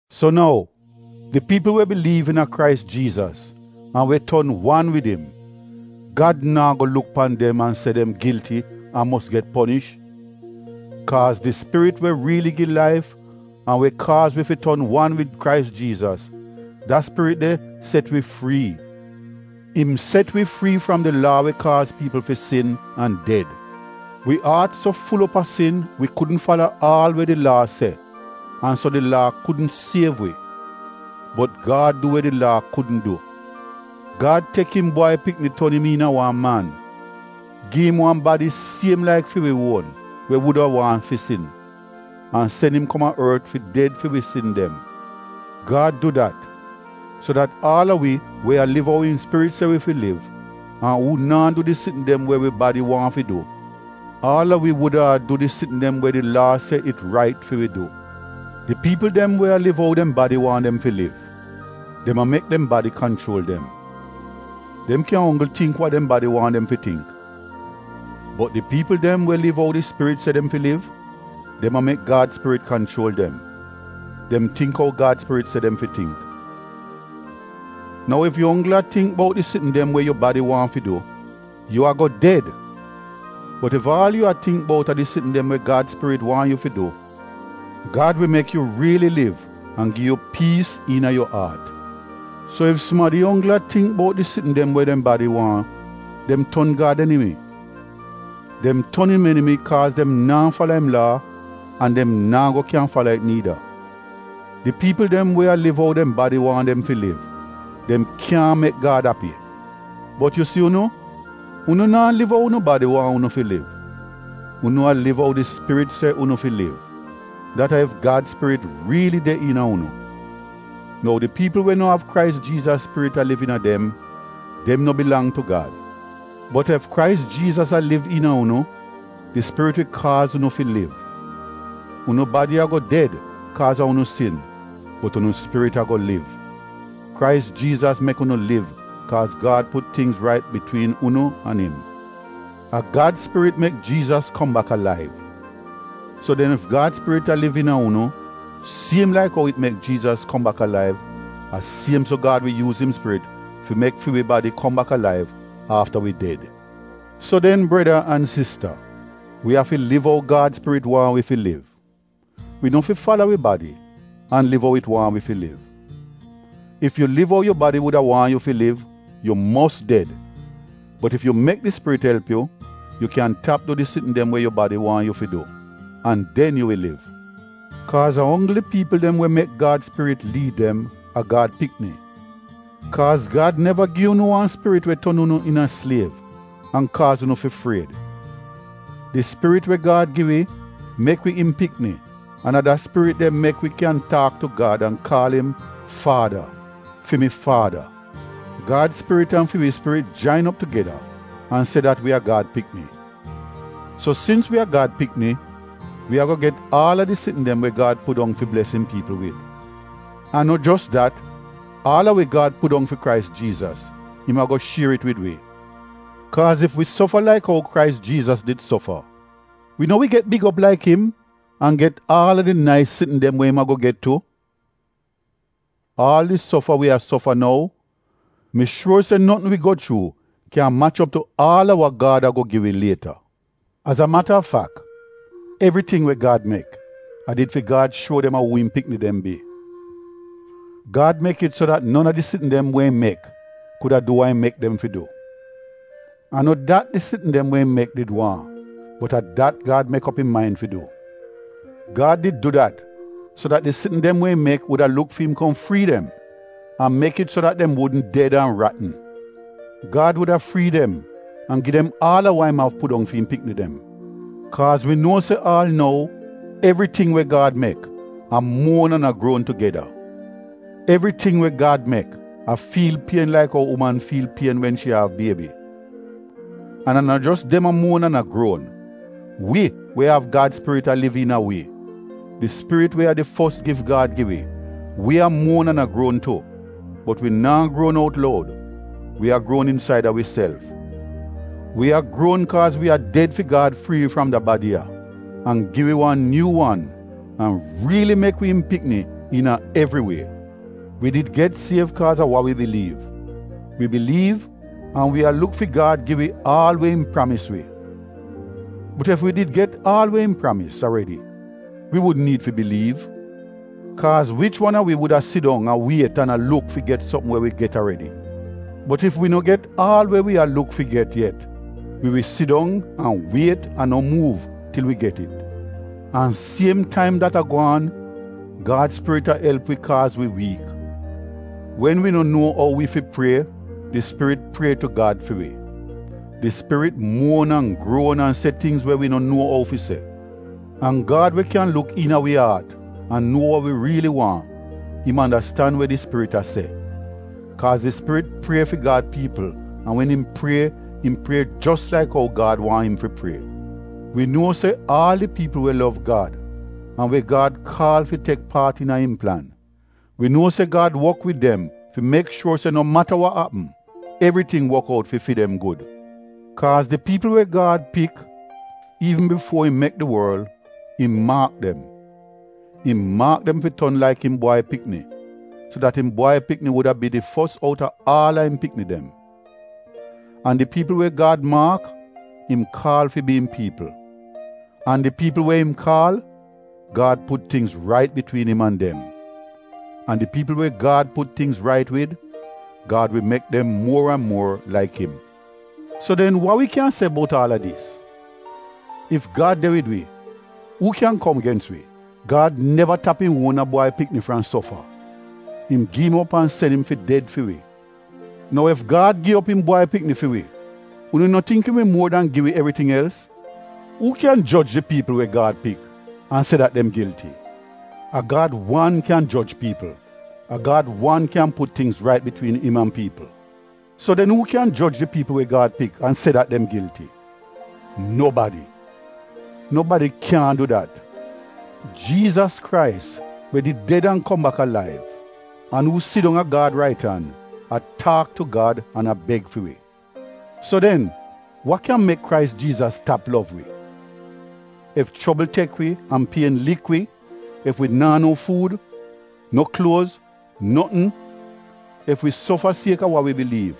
So nou, di piipl we biliiv iina a Krais Jiizas an we ton wan wid im, Gad naa go luk pan dem an se dem gilti an mos get ponish. Kaaz di Spirit we riili gi laif an we kaaz wi fi ton wan wid Krais Jiizas, da Spirit de set wi frii. Im set wi frii fram di laa we kaaz piipl fi sin an ded. Wi aat so ful op a sin wi kudn fala aal we di Laa se an so di Laa kudn siev wi. Bot Gad du we di Laa kudn du. Gad tek im Bwai Pikni ton im iina wan man, gi im wan badi siem laik fi wi uon we wuda waahn fi sin, an sen im kom a ort fi ded fi wi sin dem. Gad du dat, so dat aal a wi we a liv ou im Spirit se wi fi liv an uu naa du di sitn dem we wi badi waahn fi du, aal a wi wuda a du di sitn dem we di Laa se it rait fi wi du. Di piipl dem we a liv ou dem badi waahn dem fi liv, dem a mek dem badi kanchuol dem. Dem kyan onggl tingk wa dem badi waahn dem fi tingk. Bot di piipl dem we liv ou di Spirit se dem fi liv, dem a mek Gad spirit kanchuol dem. Dem tingk ou Gad Spirit se dem fi tingk. Nou, ef yu onggl a tingk bout di sitn dem we yu badi waahn fi du, yu ago ded. Bot ef aal yu a tingk bout a di sitn dem we Gad Spirit waahn yu fi du, Gad wi mek yu riili liv an gi yu piis iina yu aat. So ef sumadi onggl a tingk bout di sitn dem we dem badi waahn, dem ton Gad enimi. Dem ton im enimi kaaz dem naa fala im Laa, an dem naa go kyan fala it niida. Di piipl dem we a liv ou dem badi waahn dem fi liv, dem kyaahn mek Gad api. Bot yu si unu, unu naa liv ou unu badi waahn unu fi liv. Unu a liv ou di Spirit se unu fi liv, dat a ef Gad Spirit riili de iina unu. Nou di piipl we no av Krais Jiizas Spirit a liv iina dem, dem no bilang tu Gad. Bot ef Krais Jiizas a liv iina unu, di Spirit wi kaaz unu fi liv. Unu badi ago ded kaaz a unu sin bot unu spirit ago liv. Krais Jiizas mek unu liv kaaz Gad put tingz rait bitwiin unu an im. A Gad Spirit mek Jiizas kom bak alaiv. So den, ef Gad Spirit a liv iina unu, siem laik ou it mek Jiizas kom bak alaiv a siem so Gad wi yuuz im Spirit fi mek fi wi badi kom bak alaiv afta wi ded. So den breda an sista, wi afi liv ou Gad spirit waahn wi fi liv. Wi no fi fala wi badi, an liv ou it waahn wi fi liv. (Ef yu liv ou yu badi wuda waahn yu fi liv, yu mos ded.) Bot ef yu mek di Spirit elp yu, yu kyan tap du di sitn dem we yu badi waahn yu fi du, an den yu wi liv. Kaaz a onggl di piipl dem we mek Gad Spirit liid dem, a Gad pikni. Kaaz Gad neva gi unu wan Spirit we ton unu iina sliev an kaaz unu fi fried. Di Spirit we Gad gi wi, mek wi im pikni an a da Spirit de mek wi kyan taak tu Gad an kaal im “Faada, fi mi Faada.” Gad Spirit an fi wi Spirit jain op tugeda an se dat wi a Gad pikni. So sins wi a Gad pikni, wi ago get aal a di sitn dem we Gad pudong fi bles im piipl wid. An no jos dat, aal a we Gad pudong fi Krais Jiizas, im ago shier it wid wi. Kaaz ef wi sofa laik ou Krais Jiizas did sofa, wi no wi get big op laik im an get aal a di nais sitn dem we im ago get tu. Aal di sofa wi a sofa nou, mi shuor se notn wi go chuu kyan mach op tu aal a wa Gad ago gi wi lieta. Az a mata a fak, evriting we Gad mek, a did fi Gad shuo dem a uu im pikni dem bi. Gad mek it so dat non a di sitn dem we im mek kuda du wa im mek dem fi du. A no dat di sitn dem we im mek did waahn, bot a dat Gad mek op im main fi du. Gad did du dat so dat di sitn dem we im mek wuda luk fi im kom frii dem an mek it so dat dem wudn ded an ratn. Gad wuda frii dem an gi dem aal a wa im av pudong fi im pikni dem. Kaaz wi nuo se aal nou, evriting we Gad mek, a muon an a gruon tugeda. Evriting we Gad mek a fiil pien laik ou uman fiil pien wen shi a av biebi. An a no jos dem a muon an a gruon, wi we av Gad Spirit a liv iina a wi, di Spirit we a di fos gif Gad gi wi, wi a muon an a gruon tu. Bot wi naa gruon out loud, wi a gruon insaida wiself. Wi a gruon kaaz wi a ded fi Gad frii wi fram da badi ya an gi wi wan nyuu wan an riili mek wi im pikni iina evri wie. Wi did get siev kaaz a wa wi biliiv — wi biliiv an wi a luk fi Gad gi wi aal we im pramis wi. Bot ef wi did get aal we im pramis aredi wi wudn niid fi biliiv. Kaaz wich wan a wi wuda sidong a wiet an a luk fi get sopm we wi get aredi? Bot ef wi no get aal we wi a luk fi get yet, wi wi sidong an wiet an no muuv til wi get it. An siem taim dat a gwaan, Gad Spirit a elp wi kaaz wi wiik. Wen wi no nuo ou wi fi prie, di Spirit prie tu Gad fi wi. Di Spirit muon an gruon an se tingz we wi no nuo ou fi se. An Gad we kyan luk iina wi aat an nuo wa wi riili waahn, im andastan we di Spirit a se. Kaaz di Spirit prie fi Gad piipl an wen im prie im prie jos laik ou Gad waahn im fi prie. Wi nuo se aal di piipl we lov Gad an we Gad kaal fi tek paat iina im plan, wi nuo se Gad wok wid dem fi mek shuor se no mata wa apm, evriting wok out fi fi dem gud. Kaaz di piipl we Gad pik iivn bifuo im mek di worl, im maak dem. Im maak dem fi ton laik im Bwai Pikni, so dat im Bwai Pikni wuda bi di fos outa aal a im pikni dem. An di piipl we Gad maak, im kaal fi bi im piipl. An di piipl we im kaal, Gad put tingz rait bitwiin im an dem. An di piipl we Gad put tingz rait wid, Gad wi mek dem muor an muor laik im. So den wa wi kyan se bout aal a dis? Ef Gad de wid wi, uu kyan kom gens wi? Gad neva tap im uona Bwai Pikni fram sofa. Im gi im op an sen im fi ded fi wi. Nou ef Gad gi op im Bwai Pikni fi wi, unu no tingk im wi muor dan gi wi evriting els? Uu kyan joj di piipl we Gad pik an se dat dem gilti? A Gad wan kyan joj piipl! A Gad wan kyan put tingz rait bitwiin im an piipl. So den uu kyan joj di piipl we Gad pik an se dat dem gilti? Nobadi! Nobadi kyaahn du dat! Jiizas Krais we did ded an kom bak alaiv an uu sidong a Gad rait an, a taak tu Gad an a beg fi wi. So den wa kyan mek Krais Jiizas tap lov wi? Ef chobl tek wi an pien lik wi, ef wi naa no fuud, no kluoz, notn, ef wi sofa sieka wa wi biliiv,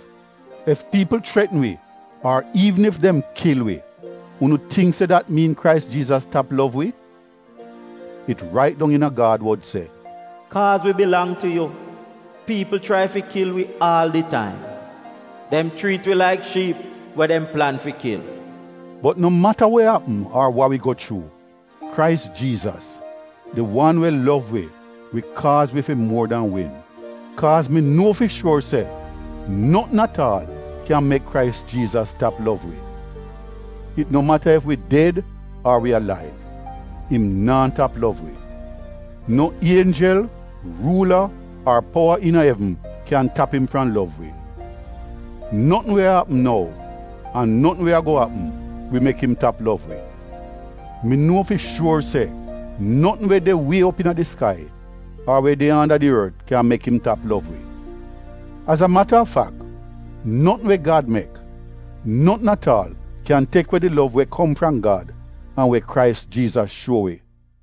ef piipl chretn wi ar iivn ef dem kil wi, unu tingk se dat miin Krais Jiizas tap lov wi? It rait dong iina Gad wod se: “Kaaz wi bilang tu yu, piipl chrai fi kil wi aal di taim; dem chriit wi laik shiip we dem plan fi kil.” Bot no mata we apm ar wa wi go chuu, Krais Jiizas, di wan we lov wi wi kaaz wi fi muor dan win. Kaaz mi nuo fi shuor se notn at aal kyan mek Krais Jiizas tap lov wi. It no mata ef wi ded ar wi alaiv, im naa tap lov wi. No ienjel, ruula ar powa iina evn kyan tap im fram lov wi. Notn we a apm nou an notn we ago apm, wi mek im tap lov wi. Mi nuo fi shuor se, notn we de wie op iina di skai ar we de anda di ort kyan mek im tap lov wi. Az a mata a fak notn we Gad mek, notn at aal kyan tek we di lov we kom fram Gad an we Krais Jiizas shuo wi.